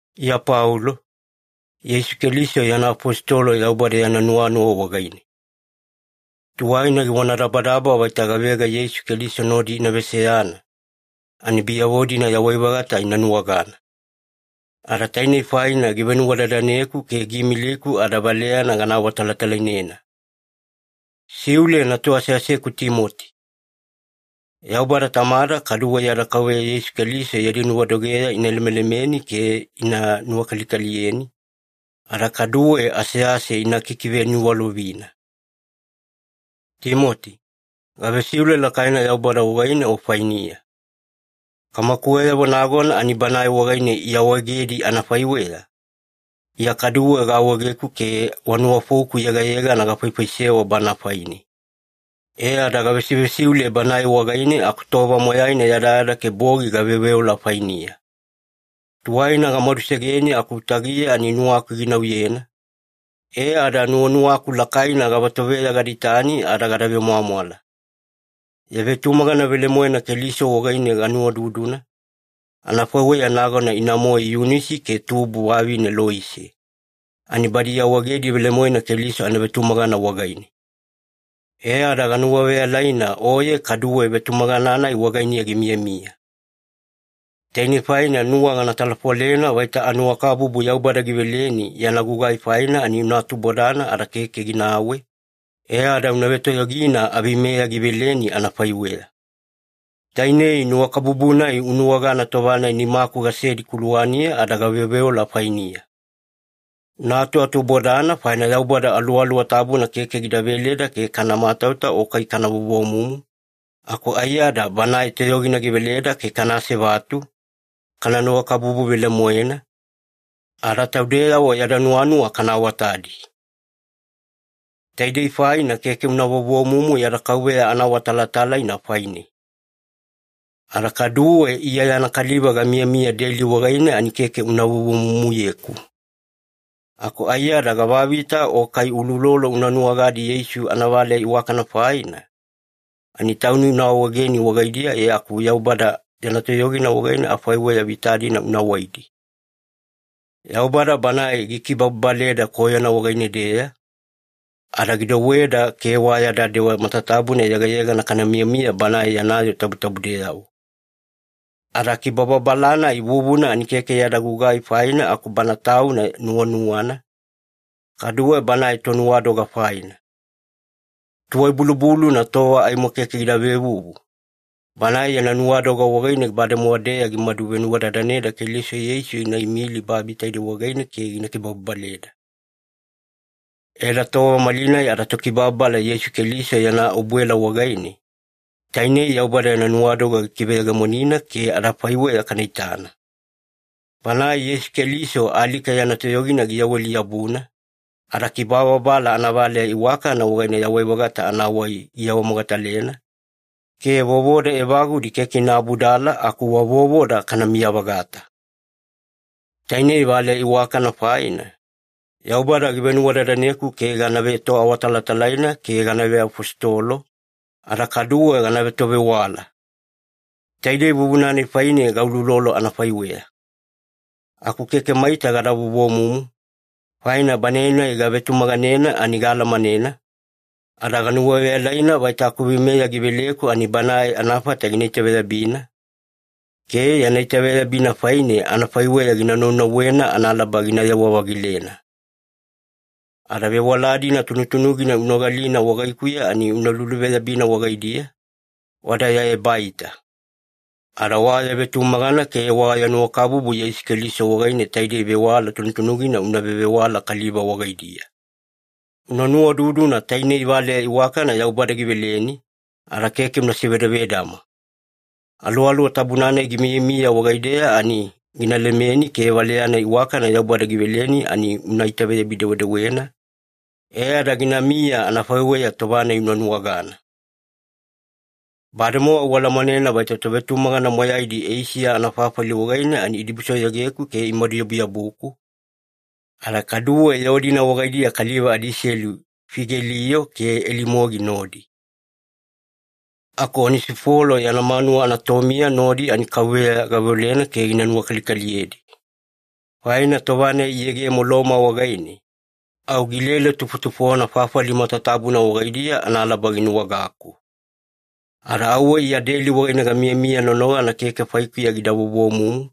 Iya Paulo, Yeisu Keliso yana afositolo Yaubada yana nuwanuwa wagaine. Tuwaina givonadabadaba vaita gavega Yeisu Keliso nodi ina veseyana, ani biyavo-dina yawai-vagata ina nuwagana. Ada tainei faina givenuwadadaneku ke giimiliku ada valeyana gana awatalatalainena. Siule natu aseaseku Timoti. Yaubada Tamada kaduwe yada Kauveya Yeisu Keliso yadi nuwadogeya ina lemelemeni ke ina nuwakalikaliyeni, ada kaduwe asease ina kikiveniwalovina. Timoti, gavesiule lakaina Yaubada wagaine o fainiya. Kamakuweyavo nagona ani Banae wagaine iawaegedi anafaiweya, Iya kaduwe gaawaegeku ke wa nuwafouku yegayegana gafaifaisewa Bana faine. E ada gavesivesiule Banae wagaine aku tova moyaina yadayada ke bogi gaveoveola fainiya. Tuwaina gamadusegeni aku utagiya ani nuwaku ginauyena, e ada nuwanuwaku lakaina gavatoveya gada itani ada gada vemwamwala. Ya vetumagana velemoena Keliso wagaine ganuwaududuna, anafaiweya nagona ina-moe Yunisi ke tubu vavine Loise, ani badi iawaegedi velemoena Keliso anavetumagana wagaine. E ada ganuwaveyalaina oye kaduwe vetumagana-nai wagainiya gimiyamiya. Tainei faina nuwa gana talafolena vaita anuwakabubu Yaubada giveleni yana gugai faina ani una atubodana ada keke ginawe, e ada una vetoyogina aveimeya giveleni anafaiweya. Tainei nuwakabubu-nai unuwagana tova-nai nimaku gasedi kuluwaniya ada gaveoveola fainiya. Una atuatubodana faina Yaubada Aluwaluwa Tabuna keke gida veleda ke kana matauta o kai kana vovomumu, aku aiyada Banae toyogina giveleda ke kana asevatu, kana nuwakabubu velemoena, ada taudeyavo yada nuwanuwa kana awatadi. Taidei faina keke una vovomumu yada Kauveya anaawatalatalaina faine. Ada kaduwe Iya yana kaliva gamiyamiya deli wagaine ani keke una vovomumuyeku. Aku aiyada gavavita o kai uloulolo una nuwagadi Yeisu anavaleya iwakana faina, ani tauni una awaegeni wagaidiya e aku Yaubada yana toyogina wagaine afaiweya vita-dina una waidi. Yaubada Banae gikibababaleda koyona wagaine-deya, ada gidouweda ke wa yada dewa matatabuna yegayegana kana miyamiya Banae yana yoo tabutabudeyavo. Ada kibababala-nai vuvuna ani keke yada gugai faina aku Bana Tauna nuwanuwana, kaduwe Banae Tonuwadoga faina. Tuwai-bulubuluna tova aimo keke gida vevuvu, Banae yana nuwadoga wagaine bademowa-deya gimadu venuwadadanena Keliso Yeisu gina imilina babi taidei wagaine ke gina kibababaleda. E ada tova malinai adaTokibababala Yeisu Keliso yana obuela wagaine, tainei Yaubada yana nuwadoga gikiveyegemonina ke adafaiweya kana itana. Bana Yeisu Keliso alika yana toyogina giyaweli-yabuna, ada kibababala anavaleya iwakana wagaine yawai-vagata anawai giawamogatalena, ke vovoda evagudi keke ina abudala aku wa vovoda kanamiya-vagata. Tainei valeya iwakana faina, Yaubada givenuwadadaneku ke gana vetoawatalatalaina ke gana veafositolo, ada kaduwe gana vetovewala. Taidei vuvuna-nai faine gauloulolo anafaiweya. Aku keke maita gada vovomumu, faina Banae-nai gavetumaganena ani gaalamanena, ada ganuwaveyalaina vaita akuveimeya giveleku ani Banae anafata gina itaveyabina, ke yana itaveyabina faine anafaiweya gina naunauwena analaba ginayewa-vagilena. Ada vewala-dina tunutunugina unogalina wagaikuya ani una luluveyabina wagaidiya, wada ya ebaita. Ada wa ya vetumagana ke wa ya nuwakabubu Yeisu Keliso wagaine taidei vewala tunutunugina una vevewala kaliva wagaidiya. Una nuwaududuna tainei valeya iwakana Yaubada giveleni, ada keke una sivedavedama. Aluwaluwa Tabuna-nai gimiyamiya wagaideya ani gina lemeni ke valeya-nai iwakana Yaubada giveleni ani una itaveyabi-dewedewena, e ada ginamiya anafaiweya tova-nai unuwagana. Bademowa ualamanena vaita tovetumagana moyaidi Eisiya anafafali wagaine ani idibusoyogeku ke imaduyabuyabuku, ada kaduwe yoo-dina wagaidiya kaliva adiselu Figelio ke Elimogi nodi. Aku Onesifolo yana manuwa anatomiya nodi ani Kauveya gaveolena ke gina nuwakalikaliyedi. Faina tova-nai giyegemo Loma wagaine, au gilele tufotufona fafali matatabuna wagaidiya analaba ginuwagaku. Ada auwe Iya deli wagaine gamiyamiya nonogana keke faikuya gida vovomumu,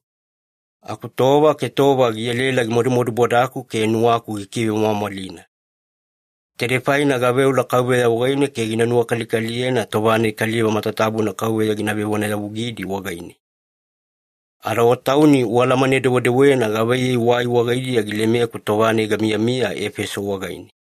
aku tova ke tova gielaela gimadumadubodaku ke nuwaku gikivemwamwalina. Taidei faine gaveola Kauveya wagaine ke gina nuwakalikaliyena tova-nai kaliva matatabuna Kauveya gina vevonayavugidi wagaine. Ada o tauni ualamane-dewedewena gavaiyei wai wagaidiya gilemeku tova-nai gamiyamiya Efeso wagaine.